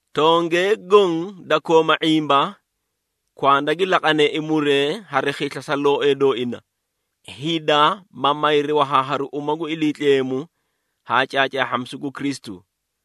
Tongee goõ da kooma ⁄imba, kwanda gi laqaneei muree hari khisla sa looee dooina, hida ma mayri wahaaharu uma gu Iliitleemu haa caacaahhamisu gu Kristu.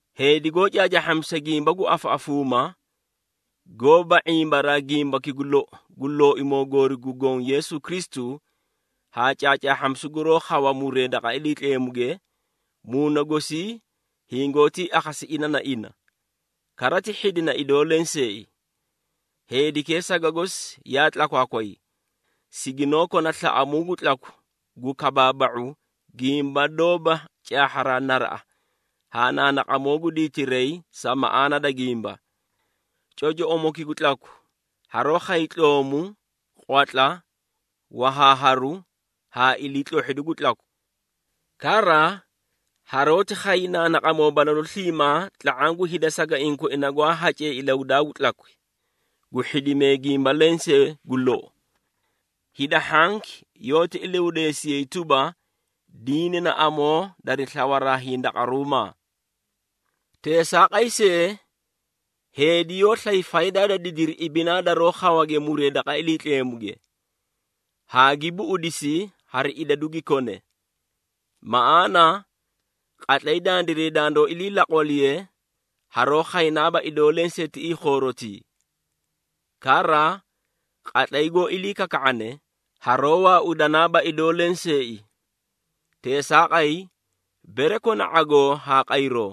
Heedi goó caacaahhamisa gimba gu afaꞌafuumaa, goóba ⁄imbaraa gimbaki gu lou gu Looimoo goori gu Goõ Yeesu Kristu haa caacaahhamisu guroó khawa muree daqa Iliitleemuge, muuna gosii hingoótii akhasi ina na ina, kara ti hhidina idoo lenseei. Heedikee saga gosi yaa tlakwaakway, siginoó kona slaꞌamuu gu tlaku gu kabaaba⁄u gimba doóba caahharaa naraꞌa haa naanaqamoo gu diitiray sa maꞌaana da gimba. Cocoꞌomoki gu tlaku haroó khay tloomu, qwatla, wahaaharu haa iliitlohhidu gu tlaku. Kara haroóti khay naanaqamoo balalu sliimaa tla⁄aã gu hida sagaiĩ koina gwaa hacee ilahudaa gu tlakwi, gu hhidimee gimba lensee gu lou. Hida hhanki yoóti ilahudeesiyay tuba, diini na amoo dari slawaraa hindaqaruumaa. Teesaaqay see, heedi yoó slay faydaa da didiri ibinaa daroo khawage muree daqa Iliitleemuge, haa gi buꞌudisi hari idadu gi kone. Maꞌaana qatlay dandiray dandoó ilii laqwaliye, haroó khaynaaba idoo lenseei tiꞌii khoorotii. Kara qatlay goó ilii kaka⁄ane, haroó waaudanaaba idoo lenseei. Teesaaqay, bere kona ⁄agoo haa qayroo,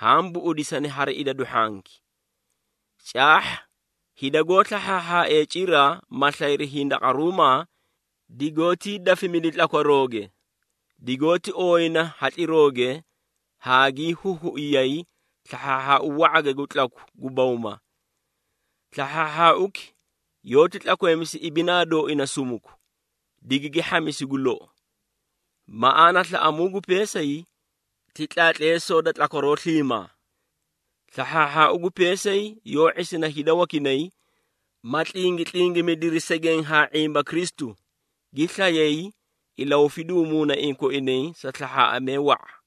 haã buꞌudisani hari idadu hhanki. Caahha hida goó slahhaahhaaee cira, ma slayri hindaqaruumaa, digoótii dafimidi tlakwarooge, digoóti ooyina hatlirooge haa gii huhuiyay slahhaahhaau wa⁄age gu tlaku gu bawma. Slahhaahhaauki yoóti tlakweemisi ibinaa dooina sumuku, digigi hhamisi gu lou. Maꞌaana slaꞌamuu gu peesay, ti tlaatleesoo da tlakwaroo sliimaa. Slahhaahhaau gu peesay yoó ⁄isina hida wakinay, ma tlingitlingimidiri segeẽ haa ⁄imba Kristu, gi slayay ilahufiduu muunaiĩ koinay sa slahhaaꞌamee wa⁄a.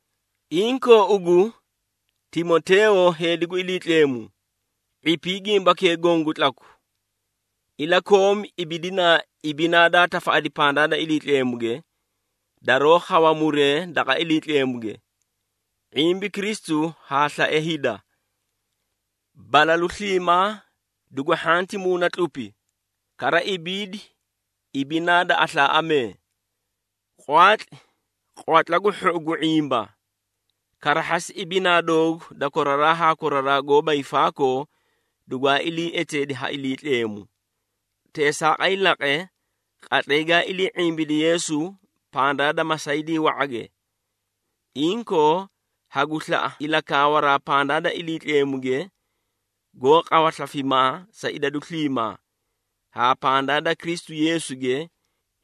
Inkoo ugu, Timoteeyo heedi gu Iliitleemu, ⁄ipii gimbakee goõ gu tlaku. Ilakoomi ibidinaa ibinaa daa tafaꞌadi pandaa da Iliitleemuge, daroó khawa muree daqa Iliitleemuge, ⁄imbi Kristu haa slae hida. Balalu sliimaa dugu hhanti muuna tlupi, kara ibiidi ibinaa da aslaaꞌamee. Qwaatli qwatla gu hhou gu ⁄imba. Karahhasi ibinaa doogu da koraraa haa koraraa goóba hiifaakoo dugwaa ilii eteedi ha Iliitleemu. Teesaaqay laqe, qatlay gaa ilii ⁄imbidi Yeesu pandaa da masaydii wa⁄age. Inkoo hagu slaꞌa ilakaawaraa pandaa da Iliitleemuge, goó qawa slafimaa sa idadu sliimaa, haa pandaa da Kristu Yeesuge,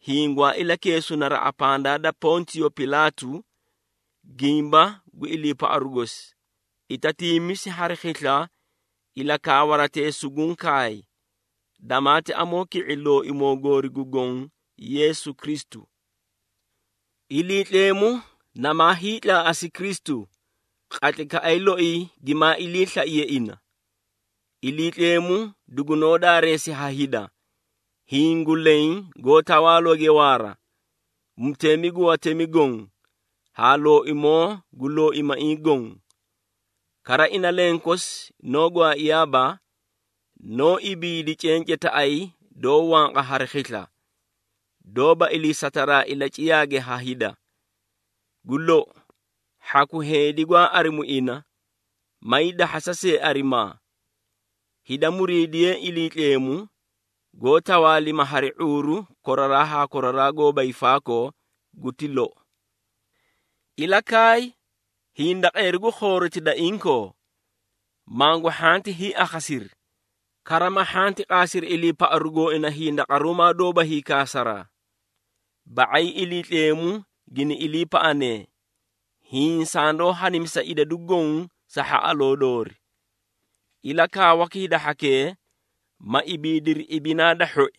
hiĩ gwaa ilakeesu naraꞌa pandaa da Pontiyo Pilaatu, gimba gu iliipaꞌaru gosi, itatiimisi hari khisla ilakaawaratee suguũ kaay, damaati amoo ki⁄i Looimoo goori gu Goõ Yeesu Kristu. Iliitleemu namaa hiitlaaꞌasi Kristu, qatlaykaꞌay loi gimaa iliislaiye ina. Iliitleemu dugunoó daareesi ha hida, hiĩ gu leẽ goó tawaalooge waara, Mutemi gu watemi goõ haa Looimoo gu looimaiĩ goõ. Kara ina lenkosi noó gwaaiyaaba, noó ibiidi cencetaꞌay doó wanqa hari khisla, doóba iliisataraa ilaciyaage ha hida. Gu lou, hhaku heedi gwaa arimu ina may dahhasa see arimaa. Hida muriidiyeei Iliitleemu, goó tawaalima hari ⁄uuru koraraa haa koraraa goóba hiifaakoo! Guti lou. Ilakaay hindaqeeri gu khooroti da inkoo, mangu hhanti hiiakhasiri, kara ma hhanti qaasiri iliipaꞌaru gooina hindaqaruumaa doóba hiikaasaraa. Ba⁄ay Iliitleemu gini iliipaꞌanee, hiĩ sandoó hadimisa idadu goõ sa hhaꞌaloo doori. Ilakaawaki hida hhakee, ma ibiidiri ibinaa da hhoi,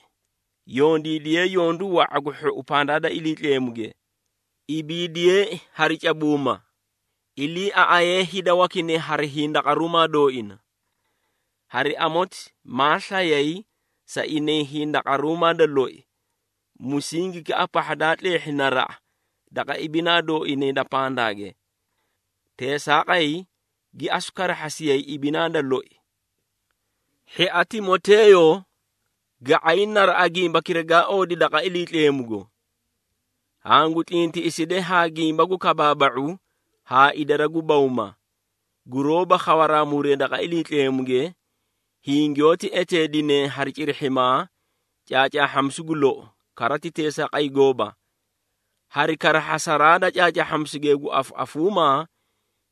yondiidiyee yondu wa⁄a gu hhou pandaa da Iliitleemuge, ibiidiyeei hari cabuuma, iliiaꞌayee hida wakinay hari hindaqaruumaa dooina. Hari amoti maa slayay sa inay hindaqaruumaa da loi, musingikaꞌa pahha daa tleehhi naraꞌa daqa ibinaa dooinay da pandaage. Teesaaqay gi asu karahhasiyay ibinaa da loi. Hhia Timoteeyo, ga⁄ay naraꞌa gimbakira gaa oodi daqa Iliitleemugo. Hangu tlintiꞌiside ha gimba gu kabaaba⁄u haa idara gu bawma, guroóba khawaraa muree daqa Iliitleemuge, hiĩ giyoóti eteedinee hari cirihhimaa “Caacaahhamisu gu lou” kara ti teesaaqay gooba. Hari karahhasaraa da caacaahhamisukee gu afaꞌafuumaa,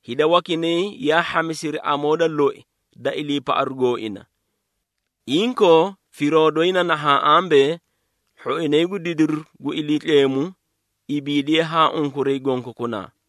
hida wakinay yaa hhamisiri amoo da loi da iliipaꞌaru gooina. Inkoo firoo doyi na nahaã ambee, hhoinay gu didiru gu Iliitleemu ibiidiyee haa unkuray gonkokunaa.